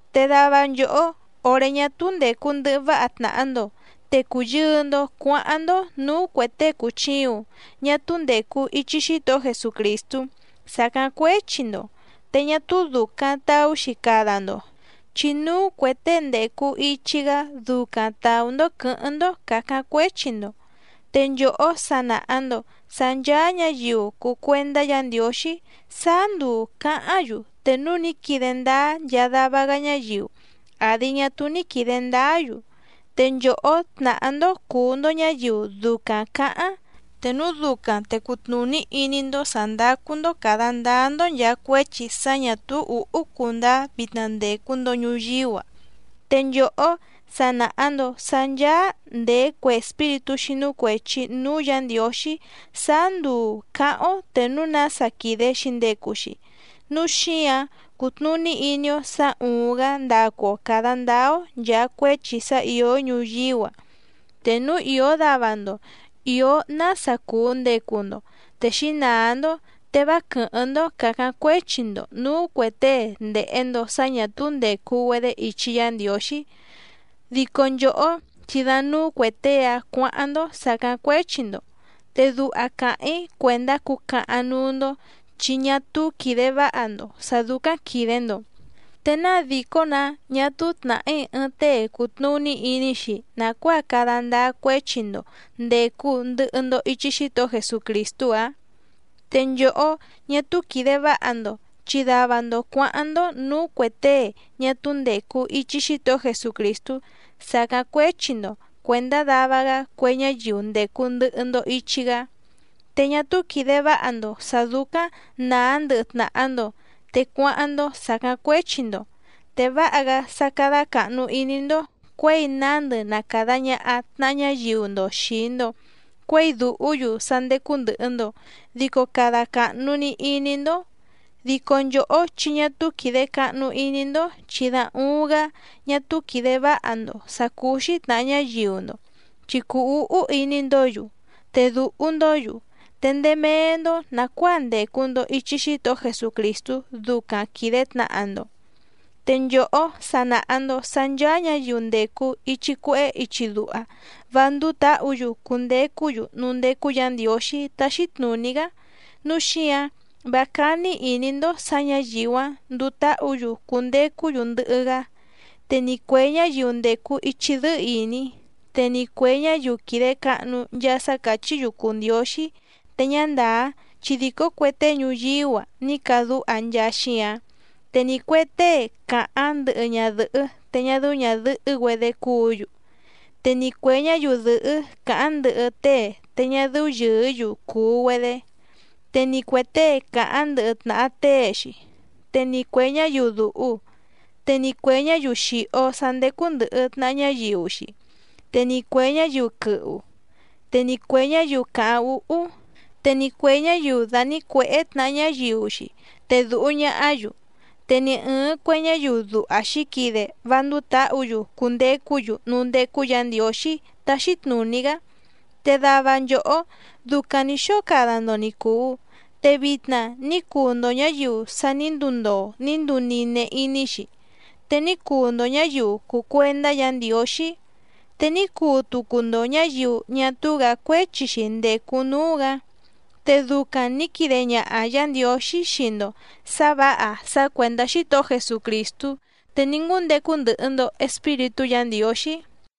Te dava nchòhó òré ñá túú ndècu ndɨhɨ váha tnàha‑ndo te cùyɨɨ‑ndo cuáháⁿ‑ndó nǔú cuè tée cùchiuⁿ ñá túú ndècu ichi Xítohó Jesucrìstú sàcáⁿ cuéchi‑ndo, te ñá túú dùcaⁿ taú‑xi cada‑ndo chi núú cuè tée ndècu ichi‑gá ducaⁿ tàú‑ndó quɨ̌hɨ́ⁿ‑ndó càcáⁿ cuéchi‑ndo. Te nchòhó sa nàha‑ndo sá ncháá ñǎyiu cùu cuendá Yǎ Ndiǒxí sáá nduu cǎháⁿ‑yu te núu ní quide ndáá nchaa dava‑gá ñáyiu àdi ñá túú ní quìde ndáá‑yu, te nchòhó tnàhá‑ndó cùu‑ndo ñáyiu ducaⁿ cǎháⁿ, te núu ducaⁿ te cutnùní iní‑ndó sǎ ndácú‑ndó càda ndáá‑ndó nchàa cuéchi sá ñǎ túú ǔhú cundáá vitna ndècu‑ndo ñuyíú‑a. Te nchòhó sa nàha‑ndo sá ncháá nděé cue espíritú xínú cuèchi núú Yǎ Ndiǒxí sáá nduu cǎháⁿ‑ó te núu nása quìde‑xi ndecu‑xi. ¡Núu xíǎⁿ cútnùní iní‑ó sǎ úúⁿ‑gǎ ndacu‑o càda ndáá‑ó nchàa cuéchi sá ìó ñuyíú‑a! Te núu ìó dava‑ndo ìó nása cùu ndecu‑ndo te xǐnàá‑ndó, te vá quɨ̀hɨ́ⁿ‑ndó càcáⁿ cuéchi‑ndo nǔú cuè tée ndèhe‑ndo sá ñà túú ndècu‑güedé ichi Yá Ndiǒxí, dico nchòhó chi da núú cuè tée‑áⁿ cuǎháⁿ‑ndó sàcáⁿ cuéchi‑ndo. Te duha càháⁿ‑í cuèndá cucahaⁿ núú‑ndó chi ñá túú quìde váha‑ndo sǎ dúcáⁿ quìde‑ndo. ¿Te náa dìcó‑nǎ ñá túú tnàhí ɨɨⁿ tée cùtnuní iní‑xi nàcuáa cada ndáá cuéchi‑ndo ndècu ndɨhɨ‑ndo ichi Xítohó Jesucrìstú‑ǎⁿ? Te nchòhó, ñá túú quìde váha‑ndo, chi dava‑ndo cuǎháⁿ‑ndó nǔú cuè tée ñá túú ndècu ichi Xítohó Jesucrìstú sàcáⁿ cuéchi‑ndo cuèndá dava‑gá cue ñáyiu ndècu ndɨhɨ‑ndo ichi‑gá. Te ñá túú quìde váha‑ndo sǎ dúcáⁿ nàá ndɨhɨ tnàha‑ndo te cuáháⁿ‑ndó sàcáⁿ cuéchi‑ndo, te váha‑gá sá cádá càhnu iní‑ndó cuěi nándɨ na càda ñaha tnaha ñáyiu‑ndo xìi‑ndo cuéi dùhú‑yu sá ndécú ndɨ̀hɨ‑ndo dico cada càhnu‑ni iní‑ndó. Dico nchòhó chi ñá túú quìde cahnu iní‑ndó chi da uuⁿ‑gá ñá túú quìde váha‑ndo sàcúú‑xí tnàha ñáyiu‑ndo, chi cùu úhú iní‑ndǒ‑yu, te dùhu‑ndó‑yu, te ndéé méé‑ndó nàcuáa ndècu‑ndo ichi Xítohó Jesucrìstú ducaⁿ quìde tnaha‑ndo. Te nchòhó sa nàha‑ndo sá ncháá ñǎyiu ndècu ichi cuehé ichi duha vá ndúú tǎhǔ‑yu cundecú‑yu núú ndécú Yǎ Ndiǒxí táxí tnùní‑gá, núu xíǎⁿ vá cání ìní‑ndó sǎ ñǎyiu‑áⁿ nduu táhǔ‑yu cundecú‑yu ndɨhɨ‑gá. Te ni cuè ñáyiu ndècu ichi dɨ́ɨ́ ìní, te ni cuè ñáyiu quìde cahnu nchaa sá càchí‑yu cùu ndióxí te ñá ndàá chi dìcó cue tée ñuyíú‑a ní cadúha nchaa xíǎⁿ, te ni cuè tée càháⁿ ndɨhɨ ñadɨ̀hɨ́ te ñá dɨ́ú ñàdɨhɨ́‑güedé cúǔ‑yu, te ni cuè ñáyiu dɨ̀hɨ́ càháⁿ ndɨhɨ tée te ñá dɨ́ú yɨ̀ɨ́‑yu cùu‑güedé, te ni cuè tée càháⁿ ndɨhɨ tnàha tée‑xi, te ni cuè ñáyiu dùhu, te ni cuè ñáyiu xìho sá ndécú ndɨ̀hɨ tnaha ñáyiu‑xi, te ni cuè ñáyiu quɨhu, te ni cuè ñáyiu càháⁿ úhú, te ni cuè ñáyiu dànícuèhé tnàha ñáyiu‑xi te dùhu ñahá‑yu, te ni ɨ̀ɨⁿ cue ñáyiu duha xǐquide vá ndúú tǎhǔ‑yu cundecú‑yu núú ndécú Yǎ Ndiǒxí táxí tnùní‑gá. Te dava nchòhó ducaⁿ nǐ xóo cada‑ndo ni cùu, te vitna ní cuu‑ndo ñǎyiu sa ní nduu ndoo ní nduu nine iní‑xi, te ní cuu‑ndo ñǎyiu cùu cuendá Yǎ Ndiǒxí, te ní cuu tucu‑ndo ñǎyiu ñá túú‑gǎ cuéchi‑xi ndècu núú‑gǎ. Te ducaⁿ nǐ quide ñaha Yǎ Ndiǒxí xii‑ndo sǎ vǎha sá cuèndá Xítohó Jesucrìstú, te ní ngúndecu ndɨhɨ‑ndo Espíritú Yǎ Ndiǒxí.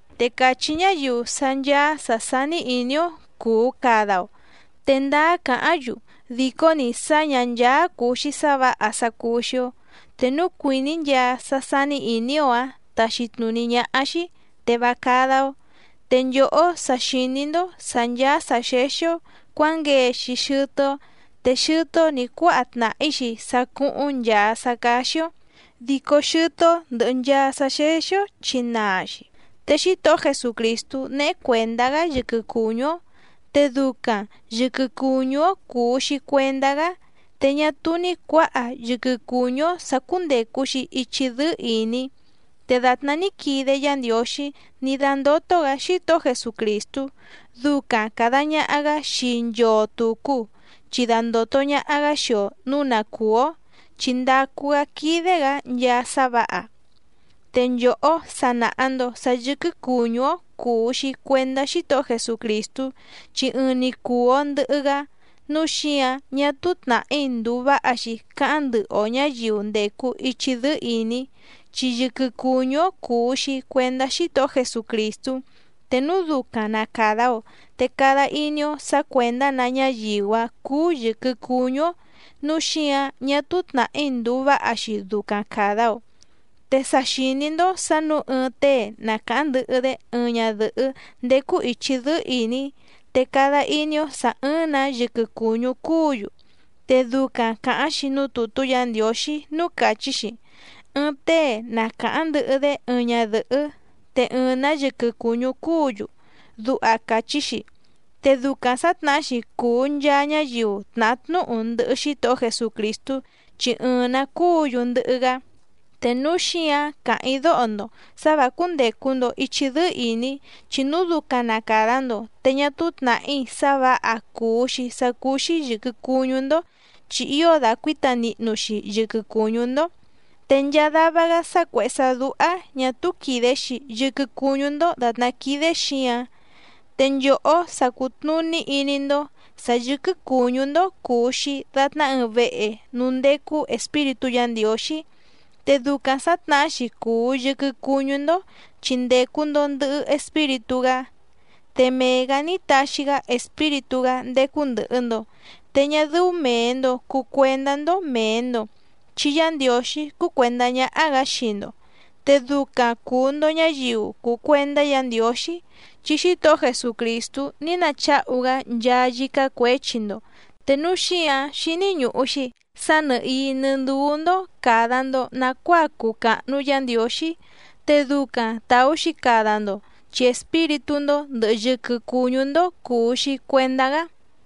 Te càchí ñáyiu sá ncháá sǎ sání ìní‑ó cuu cada‑o, te ndáá càháⁿ‑yu dìcó‑ni sá ñǎ ncháá cùu‑xi sá vǎha sá cúú‑xí‑ó. Te núu cuìní nchaa sá sání ìní‑ó‑ǎⁿ taxi tnùní ñáhá‑xí te vá cádá‑ó. Te nchòhó sa xìní‑ndó sǎ ncháá sǎ xéxí‑ó cuǎnguee‑xi xɨtɨ́‑ó, te xɨtɨ́‑ó nǐ cuáha tnàhí‑xi sá cúhúⁿ nchàa sá cáxí‑ó, dico xɨtɨ́‑ó ndɨ̀hɨ nchaa sá xéxí‑ó chi naa‑xi. Te Xítohó Jesucrìstú néhé cuèndá‑gá yɨquɨ cùñú‑ó, te ducaⁿ yɨ̀quɨ cuñú‑ó cùu‑xi cuendá‑gá, te ñá túú ní cuǎha yɨquɨ cùñú‑ó sǎ cúndècu‑xi ichi dɨ́ɨ́ ìní. Te dàtná ní quide Yá Ndiǒxí ní dándótó‑gǎ Xítohó Jesucrìstú ducaⁿ càda ñaha‑gá xii nchoo tùcu chi dandòto ñaha‑gá xii‑o nǔu na cùú‑ó, chi ndàcu‑gá quídé‑gǎ nchaa sá vǎha. Te nchòhó sa nàha‑ndo sá yɨ̀quɨ cuñú‑ó cùu‑xi cuendá Xítohó Jesucrìstú chi ɨɨⁿ‑ni cùu‑o ndɨhɨ‑gá, núu xíǎⁿ ñá túú tnàhí ndùu váha‑xi cáháⁿ ndɨhɨ‑o ñǎyiu ndècu ichi dɨ́ɨ́ ìní, chi yɨquɨ cùñú‑ó cùu‑xi cuendá Xítohó Jesucrìstú, te núu ducaⁿ na càda‑o te cada iní‑ó sǎ cuèndá‑nǎ ñáyiu‑áⁿ cúú yɨ̀quɨ cuñú‑ó, núu xíǎⁿ ñá túú tnàhí ndùu váha‑xi ducaⁿ càda‑o. Te sa xìní‑ndó sǎ nǔu ɨɨⁿ tée na càháⁿ ndɨhɨ‑dé ɨɨⁿ ñadɨ̀hɨ́ ndécú ìchi dɨ́ɨ́ ìní te cada iní‑ó sà ɨ́ɨ́ⁿ‑nǎ yɨquɨ cùñú cúǔ‑yu. Te ducaⁿ càháⁿ‑xi núú tùtú Yǎ Ndiǒxí núú càchí‑xi: “Ɨɨⁿ tée na càháⁿ ndɨhɨ‑dé ɨɨⁿ ñadɨ̀hɨ́ te ɨɨⁿ‑nǎ yɨquɨ cùñú cúǔ‑yu”, duha càchí‑xi. Te ducaⁿ sǎtnahá‑xi cùu nchaa ñáyiu tnàhá tnúhu ndɨhɨ Xítohó Jesucrìstú, chi ɨɨⁿ‑nǎ cúǔ‑yu ndɨhɨ‑gá. Te núu xíǎⁿ càháⁿ‑í dóho‑ndo sǎ vǎ cúndècu‑ndo ichi dɨ́ɨ́ ìní, chi núu ducaⁿ na càda‑ndo te ñá túú tnàhí sá vǎha cùu‑xi sá cúú‑xí yɨ̀quɨ cuñú‑ndó chi ío dàcuíta nihnu‑xi yɨquɨ cùñú‑ndó. Te nchaa dava‑gá sá cuèhé sá dúhá ñà túú quìde‑xi yɨquɨ cuñú‑ndó dàtná quídé xǐǎⁿ. Te nchòhó sa cùtnuní iní‑ndó sǎ yɨ̀quɨ cuñú‑ndó cùu‑xi datná ɨɨⁿ vehe núú ndécú Espíritú Yǎ Ndiǒxí. Te ducaⁿ sǎtnahá‑xi cùu yɨquɨ cuñú‑ndó chi ndècu‑ndo ndɨhɨ Espíritú‑gá. Te mee‑gǎ ní taxi‑gá Espíritú‑gá ndécú ndɨ̀hɨ‑ndo, te ñá dɨ́ú mèe‑ndo cuu cuendá‑ndó mèe‑ndo chi Yá Ndiǒxí cúú cuèndá ñáhá‑gǎ xii‑ndo. Te ducaⁿ cùu‑ndo ñáyiu cùu cuendá Yǎ Ndiǒxí chi Xítohó Jesucrìstú ní nacháhu‑gá nchaa yícá cuěchi‑ndo. Te núu xíǎⁿ xíní ñùhu‑xi sá nɨ̀hií nɨ́ ndúú‑ndó càda‑ndo nacuáa cuu càhnu Yá Ndiǒxí, te ducaⁿ tàú‑xi cada‑ndo chi espíritú‑ndó ndɨ̀hɨ yɨquɨ cuñú‑ndó cùu‑xi cuendá‑gá.